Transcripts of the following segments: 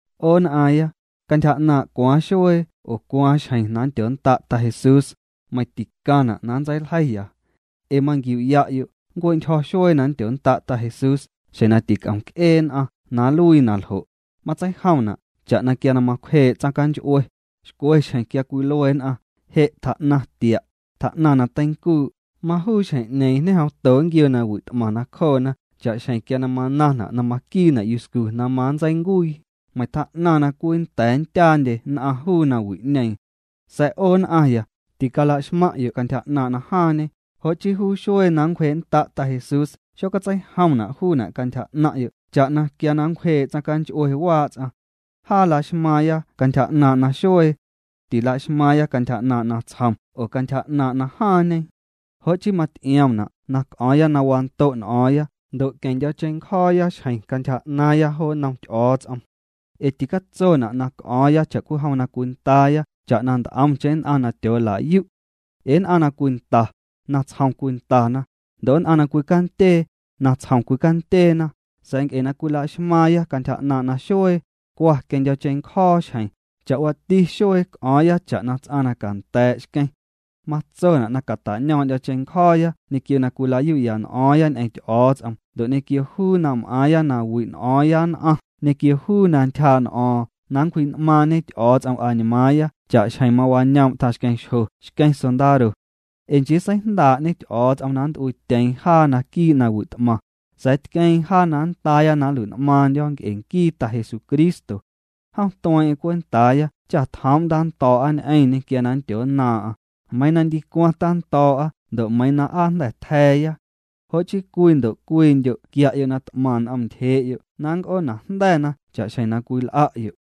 'O nn'aaⁿya, cantyja 'naaⁿ' cwaaⁿ xuee oo cwaaⁿ xjeⁿ na nndyonnda' Ta Jesús, meiⁿ ticaⁿna' na nntseiljeiya. Ee manquiu'ya'yo' nncue'ntyjo̱ xuee na nndyonnda' Ta Jesús xjeⁿ na tic'om c'ee nn'aⁿ na nluii na ljo'. Matseijomna' cha'na quia na macwjee' tsaⁿnch'ue. Xcwe xjeⁿ quia cwilue nn'aⁿ: “Je' tjaa'naⁿ tia', tjaa'naⁿ na teincuu'”, majuu xjeⁿ'ñeeⁿ ñejomto nquioo nawi' t'maⁿ nacjoona cha'xjeⁿ quia na manaⁿna' na maquiina' yuscu na manntseincuii, meiⁿ tjaa'naⁿ na cwii nnda̱a̱ nndyaandye nn'aⁿ juu nawi'ñeeⁿ. Sa̱a̱ 'o nn'aⁿya, ticalaxmaⁿ'yo' cantyja 'naaⁿ' na jaaⁿñe, jo' chii juu xuee na nncwjee'nnda' Ta Jesús xocatseijomna' juuna' cantyja 'naⁿ'yo' cha'na quia na nncwjee' tsaⁿnch'ue waa' ts'aⁿ. Jaa la'xmaaⁿya cantyja 'naaⁿ' naxuee. Tila'xmaaⁿya cantyja 'naaⁿ' natsjom oo cantyja 'naaⁿ' najaaⁿñe. Jo' chii maty'iomna' na c'o̱o̱ⁿya na wando' n'o̱o̱ⁿya ndo' queⁿndyo̱cheⁿncjo̱o̱ya xjeⁿ cantyja 'naaⁿya jo nnom Ty'o̱o̱ts'om. Ee ticatsona' na c'o̱o̱ⁿya cha'cwijom na cwindaaya cha'na nt'omcheⁿ nn'aⁿ na tyoola'yu'. Ee nn'aⁿ na cwinda, natsjom cwindana, ndo' nn'aⁿ na cwicandyee, natsjom cwindyeena, sa̱a̱ nc'e na cwilaxmaaⁿya cantyja 'naaⁿ' naxuee, cwa queⁿndyo̱cheⁿncjo̱o̱ xjeⁿ, cha'waati xuee c'o̱o̱ⁿya cha'na ts'aⁿ na canda̱a̱' xqueⁿ. Matsona' na cata'ñoom'ndyo̱ cheⁿncjo̱o̱ya ñequio na cwilayu'ya n'o̱o̱ⁿya ñ'eⁿ Ty'o̱o̱ts'om ndo' ñequio juu na m'aaⁿya na wi' n'o̱o̱ⁿya nn'aⁿ ñequio juu na ntyjaa' n'o̱o̱ⁿ na nncwji'n'maaⁿñe Ty'o̱o̱ts'om añmaaⁿya cha'xjeⁿ mawañoom' tjaⁿxqueⁿxjo xqueⁿ sondaro. Ee nchii seijndaa'ñe Ty'o̱o̱ts'om na nnt'uiityeeⁿ jaa naquii' nawi' t'maⁿ. Sa̱a̱ tqueeⁿ jaa na nndaaya na nlui'n'maaⁿndyo̱ nc'e nquii Ta Jesucristo. Jom tueeⁿ'eⁿ cwentaaya cha tjoom' na nntando̱o̱'a ñ'eⁿñê quia na nndyonnaaⁿ'aⁿ, meiiⁿ na ndicwaⁿ tando̱o̱'a ndo' meiiⁿ na aa jnda̱ tja̱a̱ya. Jo' chii cwii ndo' cwiindyo' quia'yo' na t'maⁿ n'om ntyjee'yo' na nc'oonajnda̱na cha'xjeⁿ na cwil'a'yo'.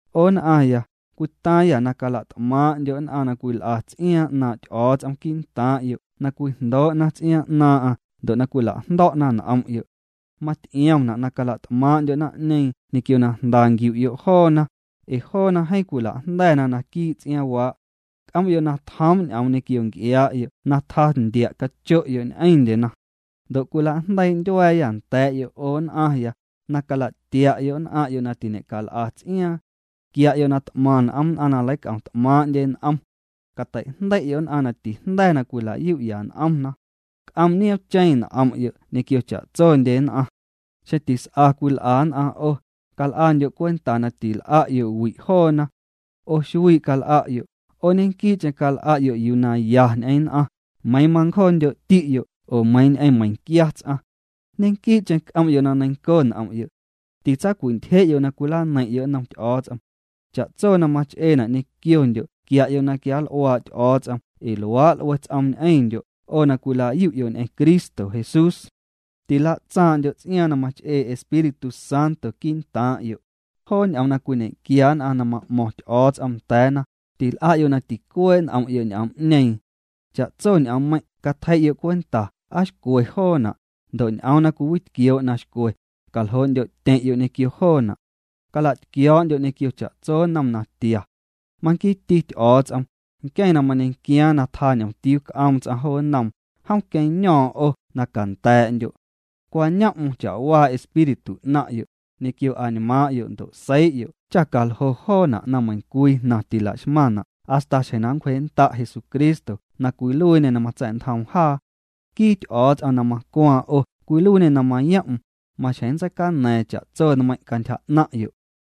'O nn'aⁿya, cwitaaⁿyâ na cala'tmaaⁿ'ndyo' nn'aⁿ na cwil'a ts'iaaⁿ 'naaⁿ' Ty'o̱o̱ts'om quii'ntaaⁿ'yo' na cwijndoo'na ts'iaaⁿ 'naaⁿ'aⁿ ndo' na cwila'jndo̱'na n'om'yo'. Maty'iomna' na cala't'maaⁿ'ndyo' naⁿ'ñeeⁿ ñequio na jnda nquiu'yo' joona, ee joona jeeⁿ cwila'jnda̱na naquii' ts'iaaⁿwaa'. C'om'yo' na tjoom' ñ'oom ñequio nc'iaa'yo' na tjaa ndia' cacho'yo' ñ'eⁿndyena. Ndo' cwila'jndeii' ndyua̱a̱yâ nda̱a̱'yo' 'o nn'aⁿya, na cala'tia'yo' nn'aⁿ'yo' na tiñe'cal'a ts'iaaⁿ. Quia'yo' na t'maⁿ n'om nn'aⁿ na leic'om t'maaⁿ'ndye n'om. Cateijndei'yo' nn'aⁿ na tijnda̱na na tila'yu'ya n'omna. C'om' nioomcheⁿ n'om'yo' ñequio cha'tsondye nn'aⁿ. Xeⁿ tis'a cwil'a nn'aⁿ 'o, cal'andyo' cwenta na tinl'a'yo' wi' joona. 'O xuii' cal'a'yo', 'o ñequii'cheⁿ cal'a'yo' yuu na ya ñ'eⁿ nn'aⁿ, meiiⁿ mancjo'ti'yo' oo meiiⁿ ñ'eⁿ meiⁿquia ts'aⁿ. Ñequii'cheⁿ c'om'yo' na neiⁿnco n'om'yo'. Tintsawi'ntyje'yo' na cwilaneiⁿ'yo' nnom Ty'o̱o̱ts'om. Cha'tso na mach'eena' ñequiondyo' quia'yo' na quianl'uaa' Ty'o̱o̱ts'om ee luaa' l'ue ts'oom ñ'eⁿndyo' 'o na cwila'yu'yo' ñ'eⁿ Cristo Jesús. Tila'tsaaⁿ'ndyo' ts'iaaⁿ na mach'ee Espíritu Santo quii'ntaaⁿ'yo'. Joo ñ'oom na cwiñequia nn'aⁿ na ma'mo̱ⁿ Ty'o̱o̱ts'om nda̱a̱na, til'a'yo' na ticuee' n'om'yo' ñ'oom'ñeeⁿ. Cha'tso ñ'oommeiⁿ' catjei'yo' cwenta aa xcwe joona', ndo' ñ'oom na cwiwitquioo' na xcwe, caljoo'ndyo'tyeⁿ'yo' ñequio joona'. Cala'tquio̱o̱'ndyo' ñequio cha'tso nnom natia. Manquiiti Ty'o̱o̱ts'om, nqueⁿ na mañequiaaⁿ na tjaa ñomtiuu m'aaⁿ ts'aⁿ jo nnoom, jom queⁿño̱o̱ⁿ 'o na canda̱a̱'ndyo'. Cwañom'm cha'waa espíritu 'naⁿ'yo', ñequio añmaaⁿ'yo' ndo' seii'yo' cha caljoo' joona' na meiⁿcwii jnaⁿ tilaxmaⁿna' hasta xjeⁿ na nncwjee'nnda' Jesucristo na cwiluiiñê na matsa̱'ntjoom jaa. Nquii Ty'o̱o̱ts'om na macwaaⁿ 'o cwiluiiñê na mayom'm, maxjeⁿ nntseicana̱a̱ⁿ cha'tso nmeiⁿ' cantyja 'naⁿ'yo'.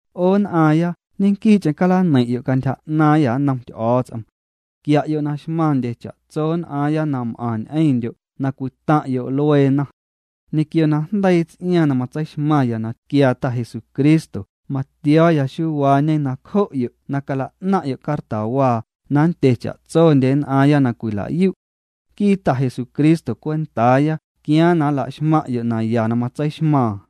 'O nn'aaⁿya ñequii'cheⁿ calaneiⁿ'yo' cantyja 'naaⁿyâ nnom Ty'o̱o̱ts'om. Quia'yo' na xmaⁿndye cha'tso nn'aaⁿya na m'aⁿ ñ'eⁿndyo' na cwitaⁿ'yo' lueena. Ñequio na jndeii ts'iaaⁿ na matseixmaⁿya na tquiaa Ta Jesucristo matio̱o̱ya xuuwaañe nacjo'yo' na cala'naⁿ'yo' cartawaa na nndye cha'tsondye nn'aaⁿya na cwila'yu'. Nquii Ta Jesucristo cwentaaya quiaaⁿ na nla'xmaⁿ'yo' naya na matseixmaaⁿ.